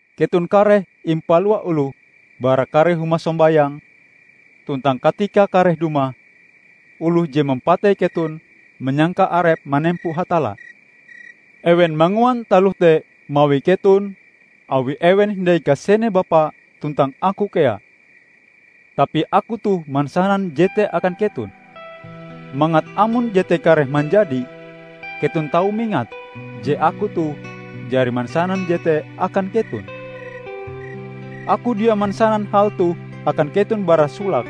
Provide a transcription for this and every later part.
Keton kareh impalua oloh bara kare huma sombayang. Tuntang katikae kareh dumah, oloh je mampatei keton manyangka arepe manempo Hatalla. Ewen manguan taloh te mawi keton awi ewen hindai kasene Bapa tuntang Aku kea. Tapi Aku toh mansanan jete akan keton, mangat amon jete kareh manjadi, keton tau mingat je Aku toh jari mansanan jete akan keton." "Aku dia mansanan hal toh akan keton bara solake,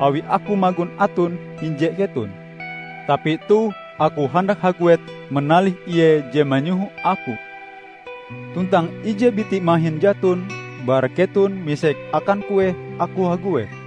awi Aku magon aton hinje keton. Tapi toh Aku handak haguet manalih Ie je manyoho Aku; tuntang ije biti mahin jaton bara keton misek akan kueh Aku haguet.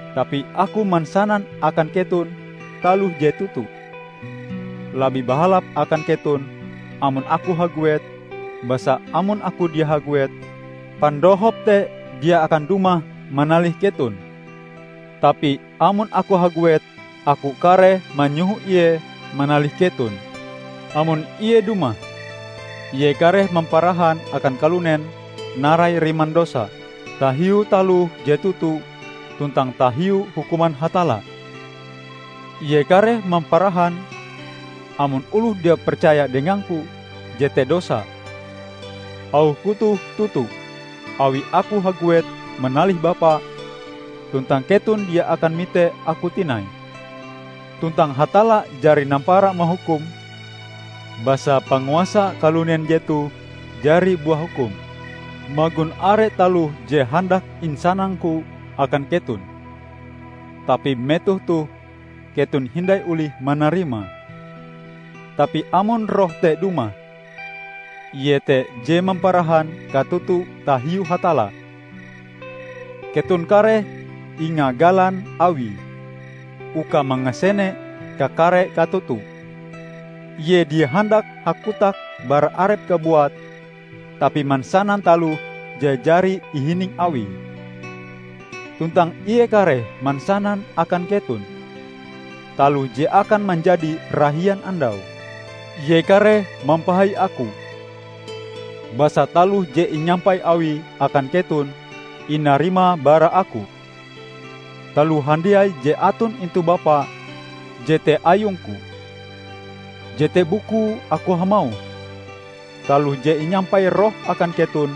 Tapi Aku mansanan akan keton taloh je toto: labih bahalap akan keton amon Aku haguet; basa amon Aku dia haguet, Pandohop te dia akan dumah manalih keton. Tapi amon Aku haguet, Aku kareh manyoho Ie manalih keton. Amon Ie dumah, Ie kareh mamparahan akan kalunen narai riman dosa, tahiu taloh je toto, tuntang tahiu hukuman Hatalla. Ie kareh mamparahan amon oloh dia percaya dengang-Ku jete dosa; auh-Ku toh toto, awi Aku haguet manalih Bapa tuntang keton dia akan mite Aku tinai; tuntang Hatalla jari nampara mahukum, basa panguasa kalunen jetoh jari buah hukum. Magon are taloh je handak insanang-Ku akan keton, tapi metoh toh keton hindai olih manarimae. Tapi amon Roh te dumah, Ie te je mamparahan katoto tahiu Hatalla, keton kareh ingagalan Awie uka mangasene kakare katoto. Ie dia handak hakotak bara Arepe kabuat tapi mansanan taloh je jari ihining Awie, tuntang Ie kareh mansanan akan keton taloh je akan manjadi rahian andau. Ie kareh mampahai Aku, basa taloh je inyampai Awie akan keton, inarimae bara Aku. Taloh handiai je aton intu Bapa jete ayung-Ku. Jete bukue Aku hamauh, taloh je inyampai Roh akan keton,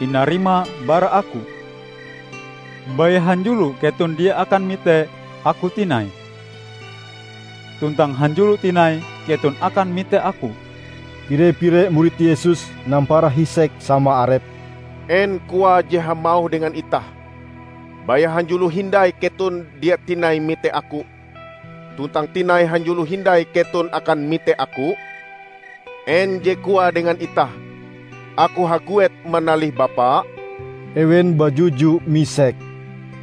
inarimae bara Aku." "Baya hanjulo keton dia akan mite Aku tinai, tuntang hanjulo tinai keton akan mite Aku." Pire-pire murid Yesus nampara hisek sama arepe, "En Koae je hamauh dengan itah: 'Baya hanjulo hindai keton dia tinai mite Aku, tuntang tinai hanjulo hindai keton akan mite Aku'? En je koae dengan itah: 'Aku haguet manalih Bapa'?" Ewen bajuju misek,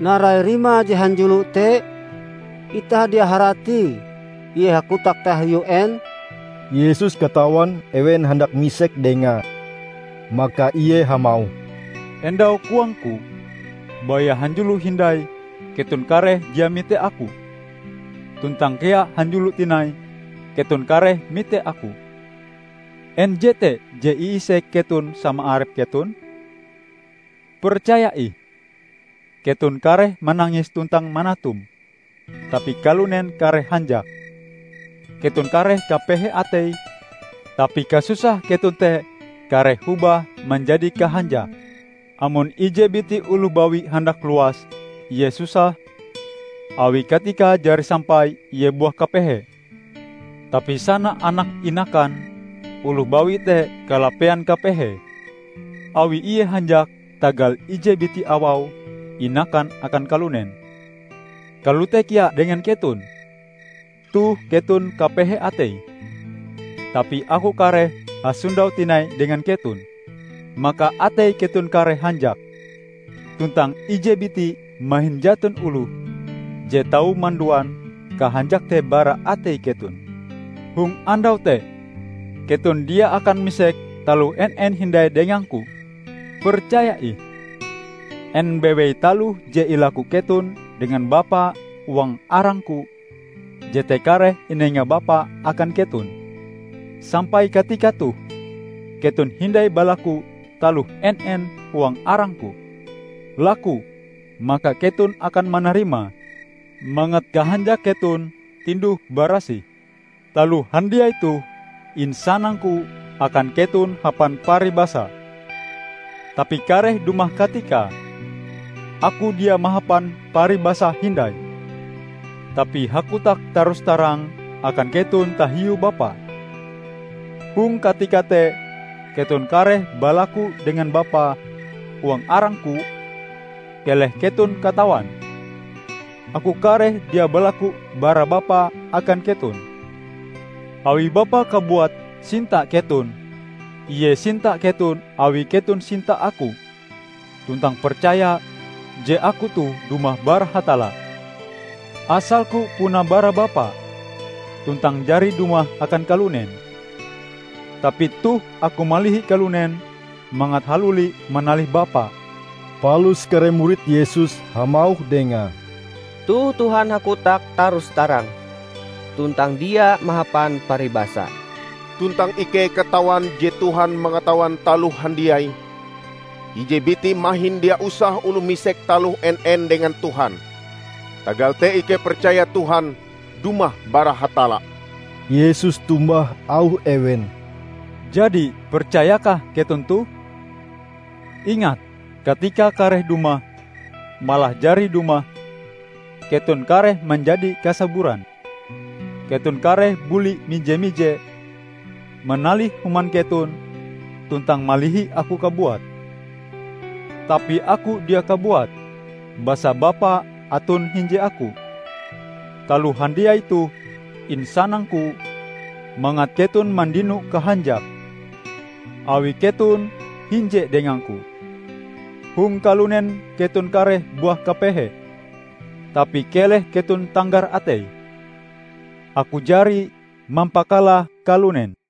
"Narai rimae je 'hanjulo' te? Itah dia haratie Ie hakotak tahiu en!" Yesus katawan ewen handak misek dengae. Maka Ie hamauh, "Endau koang-Ku, 'Baya hanjulo hindai, keton kareh dia mite Aku, tuntang kea hanjulo tinai keton kareh mite Aku'. En jete je iisek keton sama arep keton? Percaya ih, keton kareh manangis tuntang manatum, tapi kalunen kareh hanjak. Keton kareh kapehe atei, tapi kasusah keton te kareh hobah manjadi kahanjak. Amon ije biti oloh bawi handak luas, ie susah, awi katikae jari sampai ie buah kapehe. Tapi sana anake inakan oloh bawi te kalapean kapehee awi ie hanjak tagal ije biti awau inakan akan kalunen. Kalote kea dengan keton: Toh keton kapehe atei, tapi Aku kareh hasondau tinai dengan keton, maka atei keton kareh hanjak; tuntang ije biti mahin jaton oloh je tau manduan kahanjak te bara atei keton. Hong andau te, keton dia akan misek taloh en-en hindai dengang-Ku. Percaya ih: en bewei taloh je ilaku keton dengan Bapa huang arang-Ku, jete kareh inenga Bapa akan keton. Sampai katika toh keton hindai balaku taloh en-en huang arang-Ku. Laku, maka keton akan manarimae, mangat kahanjak keton tinduh barasih." "Taloh handiai toh insanang-Ku akan keton hapan paribasa. Tapi kareh dumah katikae, Aku dia mahapan paribasa hindai, tapi hakotak tarus-tarang akan keton tahiu Bapa. Hong katika te keton kareh balaku dengan Bapa huang arang-Ku; keleh keton katawan, Aku kareh dia balaku bara Bapa akan keton, awi Bapa kabuat sinta keton. Ie sinta keton awi keton sinta Aku tuntang percaya je Aku toh dumah bara Hatalla. Asal-Ku puna bara Bapa, tuntang jari dumah akan kalunen. Tapi toh Aku malihi kalunen mangat haluli manalih Bapa." Palus kare murid Yesus hamauh Dengae, "Toh Tuhan hakotak tarus-tarang tuntang dia mahapan paribasa, tuntang ikei katawan je Tuhan mangatawan taloh handiai. Ije biti mahin dia usah oloh misek taloh en-en dengan Tuhan. Tagal te ikei percaya Tuhan dumah bara Hatalla." Yesus tombah auh ewen, "Jadi percayakah keton toh? Ingat! Katikae kareh dumah, malah jari dumah, keton kareh manjadi kasaburan. Keton kareh buli mije-mije manalih human keton tuntang malihi Aku kabuat. Tapi Aku dia kabuat basa Bapa aton hinje Aku. Taloh handiai toh insanang-Ku mangat keton mandino kahanjak awi keton hinje dengang-Ku. Hong kalunen keton kareh buah kapehe. Tapi keleh keton tanggar atei! Aku jari mampakalah kalunen!"